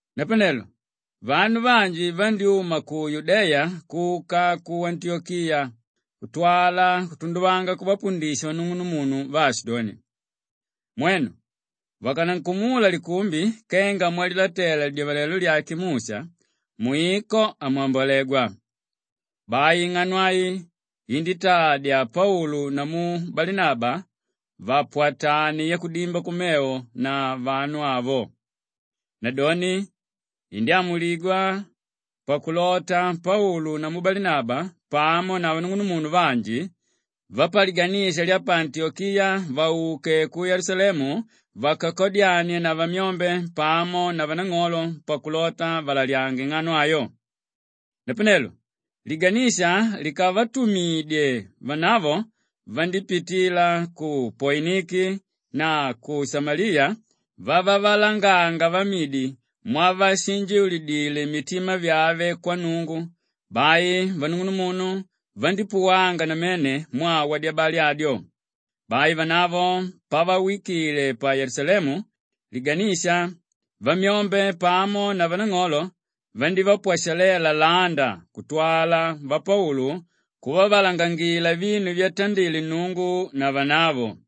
Napanelo vanu vanji vandyúma ku Yudeya kuka ku Antiyokiya kutwala kutunduvanga kuvapundisha vanung'unumunu vaashidoni, “Mwenu vakanankumula likumbi kenga mwalilatela lidyavalelo lyake Musha, mwiko hamwambolegwa.” Bai ing'ano ai iníntadya Paulu namu Balinaba vapwatane yakudimba kumevo na vanu avo. Nadoni indyámuligwa pakulota Paulu namu Balinaba pamo na vanung'unumunu vanji vapaliganisha lya pa Antiyokiya vauke ku Yelusalemu vakakadyanie na vamyombe pamo na vanang'olo pakulota valalyange ing'ano ayo. Napanelo liganisha likavatumidye, vanavo vandípitila ku Poiniki na ku Shamaliya vavavalanganga vamidi mwavashinjiulidile mitima vyave kwa Nnungu; bai vanung'unumunu vandípuwanga namene mwaa wadyabali adyo. Bai vanavo pavawikile pa Yelusalemu, liganisha, vamyombe pamo na vanang'olo vandívapwashalela landa kutwala vapaulu kuvavalangangila vinu vyatandile Nnungu na vanavo.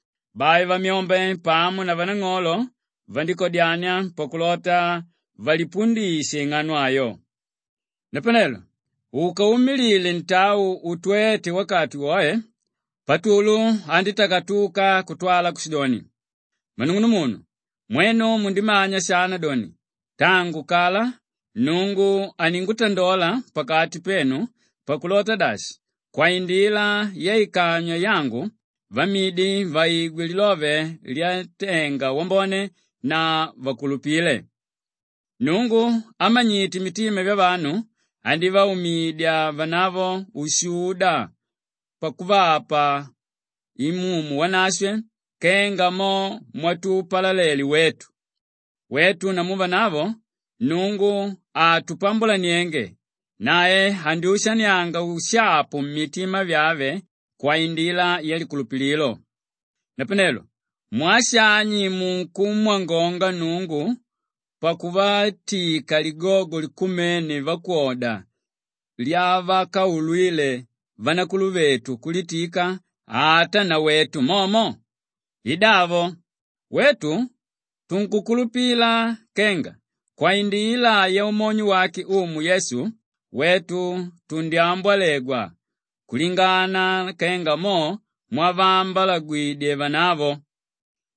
Bai vamyombe pamo na vanang'olo vandíkadyania pakulota valipundishe ing'ano ayo. Napanelo ukaumilile ntau utwéte wakati woe, Patulu andítakatuka kutwala kushidoni, “Mmanung'unumunu, mwenu mundimanya shana doni tangu kala Nnungu aningutandola pakati penu pakulota dashi, kwaindila yaikanywa yangu vamidi vaigwe lilove lyantenga wambone na vakulupile. Nnungu ámanyite mitima vyavanu, andivaumidya vanavo ushuda pakuvapa Imumu Wanashwe kenga mo mwatupalalele wetu. Wetu namu vanavo Nnungu hatupambulanienge; nae andyushanianga ushapu mitima vyave kwaindila yalikulupililo. Napanelo mwaa shani munkumwangonga Nnungu pakuvatika ligogo likumene vakwoda lyavakaulwile vanakuluvetu kulitika ata nawetu momo? I davo, wetu tunkukulupila kenga kwaindila yaumonyo wake Umu Yesu, wetu tundyambolegwa kulingana kenga mo mwavaambwalagwidye vanavo.”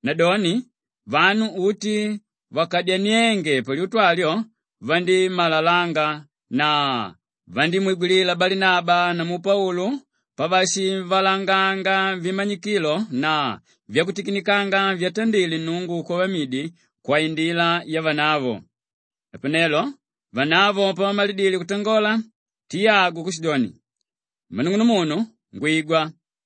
Nadoni vanu uti vakadyaniénge palyutu alyo vandímalalanga na vandímwigwilila Balinaba namu Paulu pavashivalanganga vimanyikilo na vyakutikinikanga vyatandile Nnungu kwavamidi kwaindila yavanavo. Napanelo vanavo pavamalidile kutangola Tiyagu kushidoni, “Mmanung'unumunu, ngwigwa!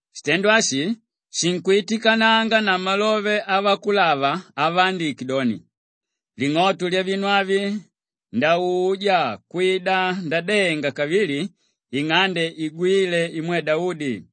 Shitendo ashi shinkwitikananga na malove avakulava avaandike doni, “ ‘Ling'oto lyavinu avi ndauja kwida ndadenga kavili ing'ande igwíle imwe Daudi;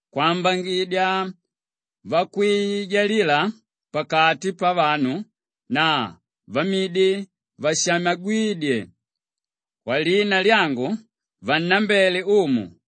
kwambangidya vakwijalila pakati pavanu na vamidi vashamagwídye kwalina lyangu vannambele Umu,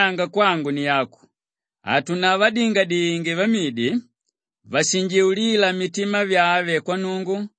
“Napavedoni kulalyanga kwangu ni aku, hatunavadingadinge vamidi vashinjiulíla mitima vyave kwa Nnungu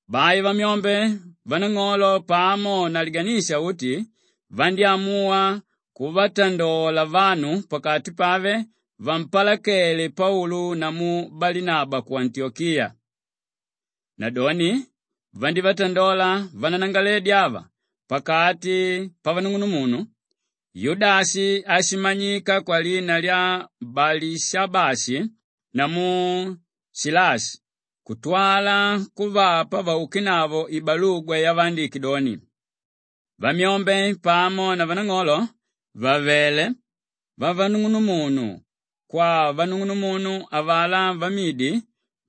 Bai vamyombe, vanang'olo pamo na liganisha uti vandyámuwa kuvatandola vanu pakati pave vampalakele Paulu namu Balinaba ku Antiyokiya. Nadoni vandívatandola vananangalaledi ava pakati pavanung'unumunu: Yudashi áshimanyika kwalina lya Balishabashi namu Shilashi kutwala kuvapa vaukenavo ibalugwa yavaandike doni, “Vamyombe pamo na vanang'olo vàvele vanung'unumunu, kwavanung'unumunu avalá vamidi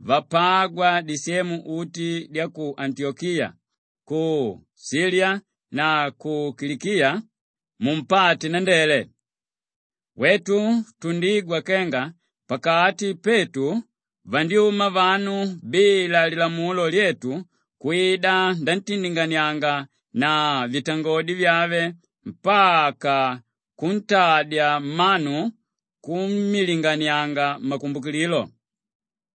vapágwa disemu uti dya ku Antiyokiya, ku Shiliya na ku Kilikiya, mumpate nandele. “Wetu tundigwa kenga pakati petu vandyuma vanu bila lilamulo lyetu kwida nantindinganianga na vitangodi vyave mpaka kuntadya mmanu kummilinganianga makumbukililo.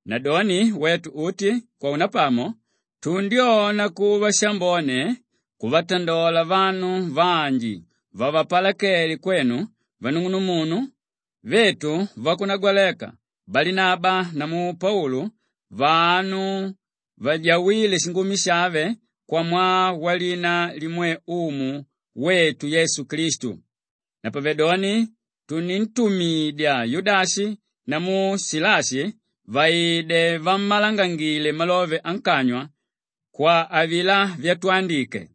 Nadoni wetu uti kwaunapamo tundyona kuva shambone kuvatandola vanu vanji vavapalakedye kwenu vanung'unumunu vetu vakunagwaleka Balinaba namu Paulu vanu vajawíle shingumi shave kwamwaa walina limwe Umu wetu Yesu Klistu. Napavedoni tunintumidya Yudashi namu Shilashi vaide vammalangangile malove ankanywa kwa avilá vyatwandike.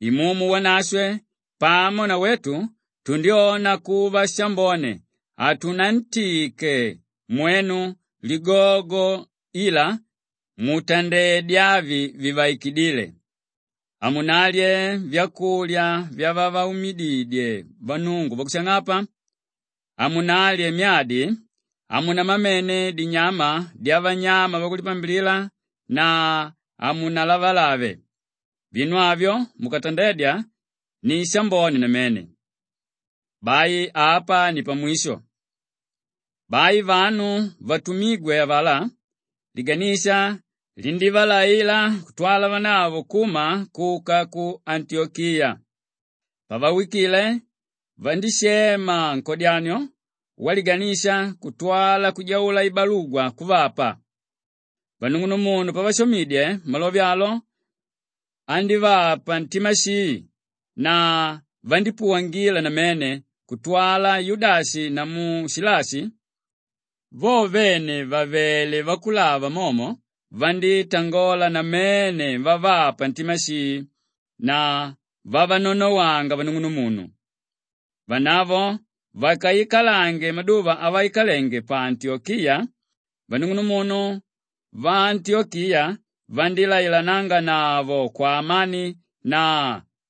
Imumu Wanashwe pamo na wetu tundyona kuva shambone hatunantike mwenu ligogo ila mutandedye avi vivaikidíle: Hamunalye vyakulya vyavavaumididye vannungu vakushang'apa, hamunalye myadi, hamunamamene dinyama dyavanyama vakuvapambilila na hamunalavalave. Vinu avyo mukatandedya ni shambone namene. “Bai apa ni pamwisho.” Bai vanu vatumígwe avalá liganisha lindívalaila kutwala vanavo kuma kuka ku Antiyokiya. Pavawikile, vandíshema nkodyanio waliganisha kutwala kujaula ibalugwa kuvapa. Vanung'unumunu pavashomidye, malove alo andívapa ntima shii na vandípuwangila namene kutwala Yudashi namu Shilashi vo vene vàvele vakulava momo, vandítangola namene vavapa ntima shii na vavanonowanga vanung'unumunu. Vanavo vakaikalange maduva avaikalenge pa Antiyokiya, vanung'unumunu vaantiyokiya vandílailananganavo kwaamani na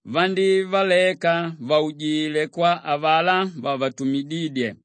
vandívaleka vaujile kwa avalá vavatumidídye.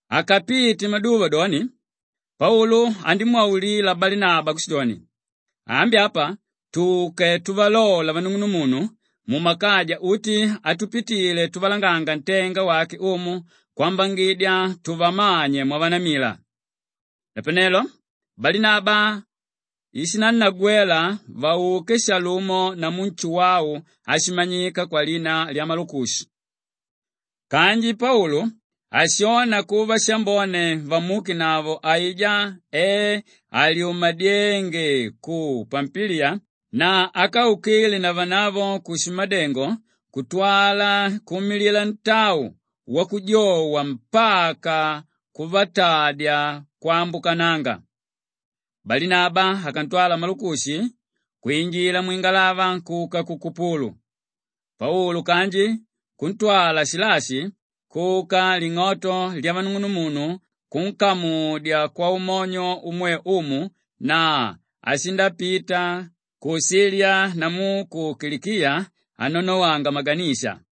Akapite maduva doni, Paulu andímwaulila Balinaba kushidoni, “Ambi apa tuke tuvalola vanung'unumunu mumakaja uti atupitile tuvalanganga ntenga wake Umu kwambangidya tuvamanye mwavanamila.” Napanelo Balinaba ishinannagwela vauke shalumo namu Nshuwau áshimanyika kwalina lya Malukushi. Kanji Paulu hashona kuva shambone vamuukenavo aijá e alyumadyénge ku Pampiliya na ákaukile na vanavo kushimadengo kutwala kuumilila ntau wakujowa mpaka kuvatadya kwambukananga. Balinaba akantwala Malukushi kwinjila mwingalava kuka ku Kupulu. Paulu kanji kuntwala Shilashi kuka ling'oto lyavanung'unumunu kunkamudya kwaumonyo umwe Umu na ashindapita ku Shiliya namu ku Kilikiya anonowanga maganisha.